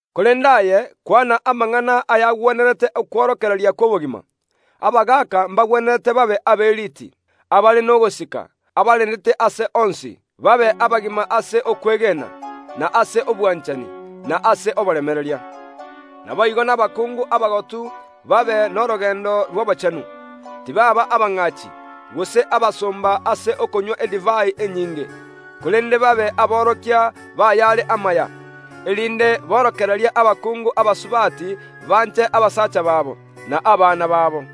Korende aye, nekobetereretie gokwana amang’ana agwenerete okworokereria gw’okwegena. Oorokererie abagaaka babe aberiiti, abare n’ogosika, aberendete ase onsi, babe abagima ase okwegena, ase obwanchani, na ase oboremereria. Naboigo oorokererie abakungu abagotu babe norogendo rw’obochenu, tibaaba abang’aachi, gose abasomba gochia ase edivai. Yababetereirie barabwo babe aborokia b’ayare amaya, erinde borokererie abakungu abake banche abasacha babo, na abana babo.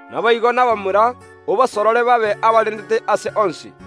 Naboigo, obasorore abamura babe aberiti ase onsi.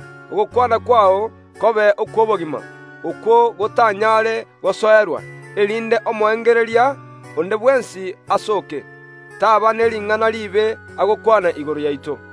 Ogokwana kwao kobe ogoikeranu, okwo gotanyaare gosoerwa, erinde omoengereria onde bwensi asooke, taaba ne ring’ana riibe agokwana igoro yaito.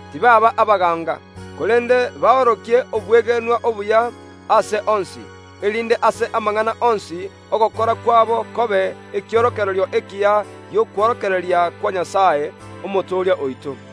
tibaaba abakobaibera. Korende babaorokie obwegenwa obuya ase onsi, erinde ase amang’ana onsi yogokora kwabo abe ekiorokererio ekiya gi’okworokereria kwa Nyasae, Omotooria oito.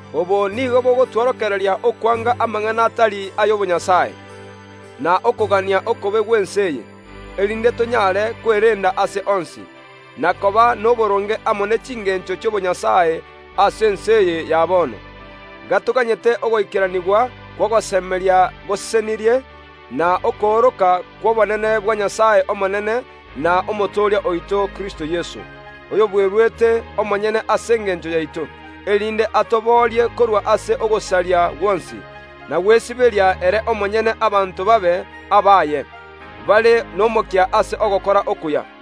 Obo nigo bogotworokereria okwanga amang’ana atari y’obonyasae ase obomenyo bwaito, na okogania okobe gw’ense eye, erinde tonyaare kwerenda ase onsi, na koba noboronge amo ne chingeencho chi’obonyasae ime ase ense eye, gatoganyete ogoikeranigwa ogosemeria kwe Rituko Risesenirie, na okooroka kw’obonene bwa Nyasae omonene, na Omotooria oito Kristo Yeso, Ere omonyene oyobweruete ase engencho yaito, erinde atoboorie korwa ase ogosaria gwonsi, naboigo gotosibia ere omonyene abanto babe abaye, bare nomokia ase ogokora okuya.